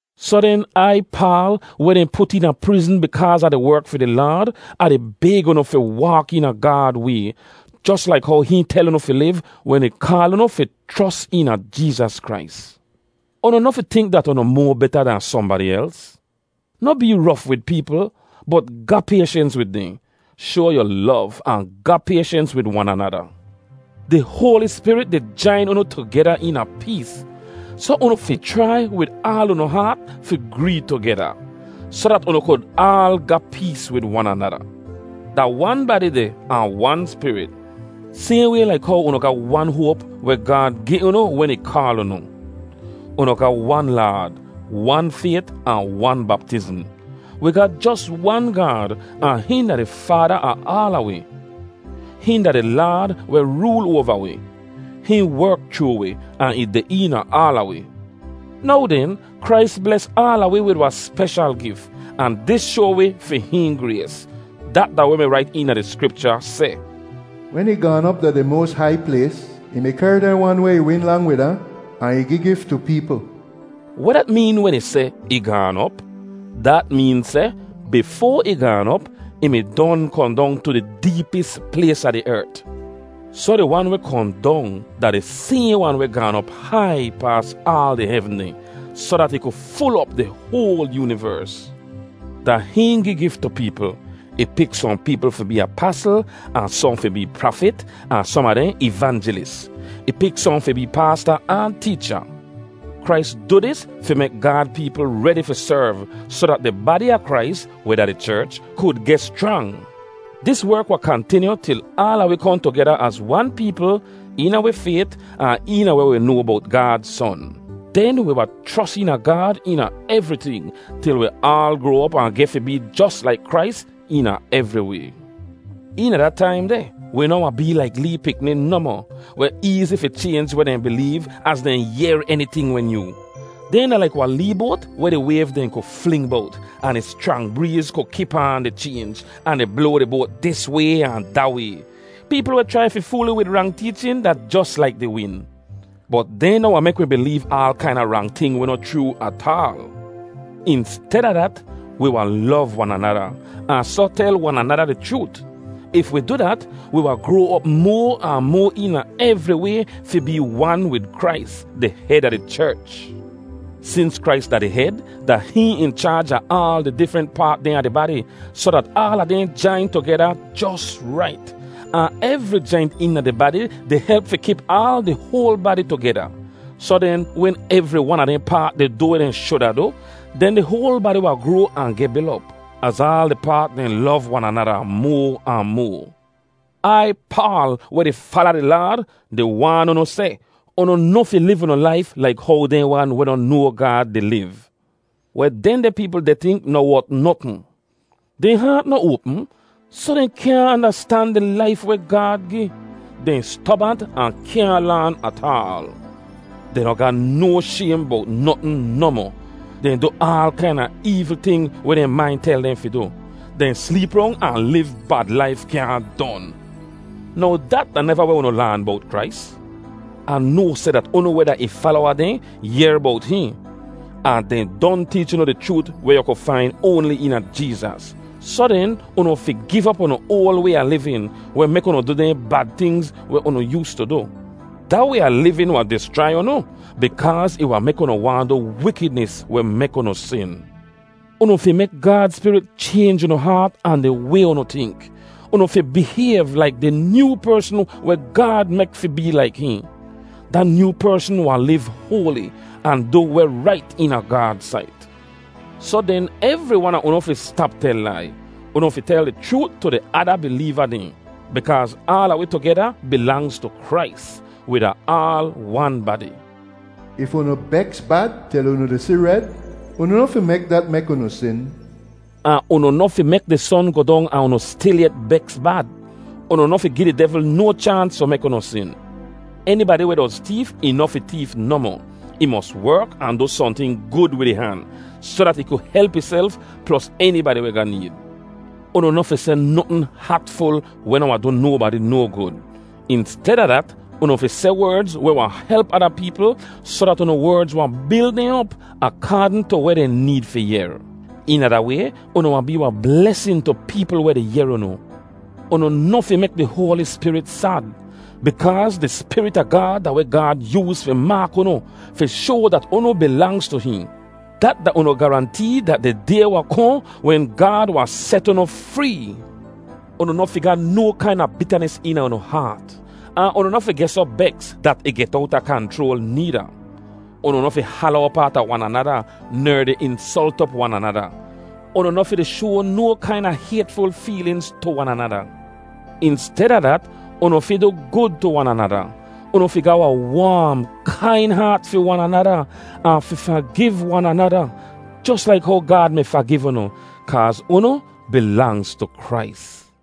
Soh den, Ai, Paal, weh dehn put eena prizn bikaaz Ah di werk fi di Laad, Ah di bayg unu fi waak eena Gaad way, jos laik how hihn tel unu fi liv wen ih kaal unu fi chros eena Jeezas Krais. Unu noh fi tink dat unu moa beta dan sohnbadi els. Noh bee rof wid peepl, bot ga payshens wid dehn. Shoa yu lov ahn ga payshens wid wan anada. Di Hoali Spirit di jain unu tugeda eena pees, soh unu fi chrai wid aal unu haat fi gree tugeda, soh dat unu kud aal ga pees wid wan anada. Da wan badi deh ahn wan Spirit, sayhn way laik how unu ga wan hoap weh Gaad gi unu wen ih kaal unu. Unu ga wan Laad, wan fayt, ahn wan baptizm. Wi ga jos wan Gaad ahn hihn da di Faada a aala wi. Hihn da di Laad weh rool oava wi. Hihn werk chroo wi, ahn ih deh eena aala wi. Now den, Krais bles aala wi wid wahn speshal gif, ahn dis shoa wi fi hihn grays. Dat da weh mi rait eena di Skripcha seh, “Wen ih gaan op tu di moas hai plays, ih mi kehr dehn wan weh ih win lang wid ahn ahn ih gi gif tu peepl.” Weh dat meen wen ih seh, “Ih gaan op”? Dat meen seh, bifoa ih gaan op, ih mi don kohn dong tu di deepis plays a di ert. Soh di Wan weh kohn dong da di sayhn wan weh gaan op hai paas aal di hevn dehn, soh dat ih ku ful op di hoal yoonivers. Da hihn gi gif tu peepl. Ih pik sohn peepl fi bee apasl, ahn sohn fi bee prafit, ahn som a dehn ivanjelis. Ih pik sohn fi bee paasta ahn teecha. Krais du dis fi mek Gaad peepl redi fi serv soh dat di badi a Krais, weh da di cherch, kud geh schrang. Dis werk wahn kantinyu til aala wi kohn tugeda az wan peepl, eena wi fayt, ahn eena weh wi noa bowt Gaad Son. Den wi wahn chros eena Gaad eena evriting til wi aal groa op ahn geh fi bee jos laik Krais eena evri way. Eena da taim deh wi noh wahn bee laik lee pikni nohmoh, weh eezi fi chaynj weh dehn bileev az dehn yehr eniting weh nyoo. Dehn da laik wahn lee boat weh di wayv dehn ku fling bowt, ahn di schrang breez ku kip aan di chaynj, ahn di bloa di boat dis way ahn da way. Peepl weh chrai fi fool wi wid rang teechin da jos laik di win. Bot dehn noh wahn mek wi bileev aal kaina rang ting weh noh chroo ataal. Insteda dat, wi wahn lov wan anada, ahn soh tel wan anada di chroot. If wi du dat, wi wahn groa op moa ahn moa eena evri way fi bee wan wid Krais, di hed a di cherch. Sins Krais da di hed, da hihn in chaaj a aal di difrent paat dehn a di badi, soh dat aala dehn jain tugeda jos rait. Ahn evri jaint eena di badi di help fi kip aal di hoal badi tugeda. Soh den, wen evri wan a dehn paat di du weh dehn shuda du, den di hoal badi wahn groa ahn geh bil op, az aal di paat dehn lov wan anada moa ahn moa. Ai Paal, weh di fala di Laad, di waan unu seh, unu noh fi liv unu laif laik how dehn wan weh noh noa Gaad di liv. Weh dehndeh peepl deh tink noh wot notn. Dehn haat noh oapm, soh dehn kyaahn andastan di laif weh Gaad gi. Dehn stobant ahn kyaahn laan ataal. Dehn noh ga no shaym bowt notn nohmoh. Dehn du aal kaina eevl ting weh dehn main tel dehn fi du. Dehn sleep rong ahn liv bad laif kyaahn don. Now, dat da neva weh unu laan bowt Krais! Ah noa seh dat unu weh da ih falowa dehn yehr bowt hihn, ahn dehn don teech unu di chroot weh yu ku fain oanli eena Jeezas. Soh den, unu fi giv op unu oal way a livin, weh mek unu du dehn bad tingz weh unu yoostu du. Da way a livin wahn dischrai unu, bikaaz ih wahn mek unu waahn du wikidnis weh mek unu sin. Unu fi mek Gaad Spirit chaynj unu haat ahn di way unu tink. Unu fi bihayv laik di nyoo persn weh Gaad mek fi bee laik hihn. Da nyoo persn wahn liv hoali, ahn du weh rait eena Gaad sait. Soh den, evri wan a unu fi stap tel lai. “Unu fi tel di chroot tu di ada bileeva dehn,” bikaaz aala wi tugeda bilangz tu Krais. Wi da aal wan badi. “If unu beks bad til unu di si red, unu noh fi mek dat mek unu sin.” Ahn unu noh fi mek di son goh dong ahn unu stilyet beks bad. Unu noh fi gi di devl no chaans fi mek unu sin. Enibadi weh doz teef, ih noh fi teef nohmoh. Ih mos werk, ahn du sohnting gud wid ih han, soh dat ih ku help ihself plos enibadi weh ga need. Unu noh fi seh notn hatful weh noh wahn du nobadi no gud. Insteda dat, unu fi seh werdz weh wahn help ada peepl soh dat unu werdz wahn bil dehn op, akaadn tu weh dehn need fi yehr. Eena da way, unu wahn bee wahn blesin tu peepl weh di yehr unu. Unu noh fi mek di Hoali Spirit sad. Bikaaz di Spirit a Gaad da weh Gaad yooz fi maak unu fi shoa dat unu bilangz tu hihn. Dat da unu garantee dat di day wahn kohn wen Gaad wahn set unu free. Unu noh fi ga no kaina bitanis eena unu haat; ahn unu noh fi geh soh beks dat ih get owta kanchroal needa. Unu noh fi hala op aata wan anada ner di insolt op wan anada. Unu noh fi di shoa no kaina haytful feelinz tu wan anada. Insteda dat, unu fi du gud tu wan anada. Unu fi ga wahn waam, kain haat fi wan anada, ahn fi fagiv wan anada, jos laik how Gaad mi fagiv unu, kaaz unu bilangz tu Krais.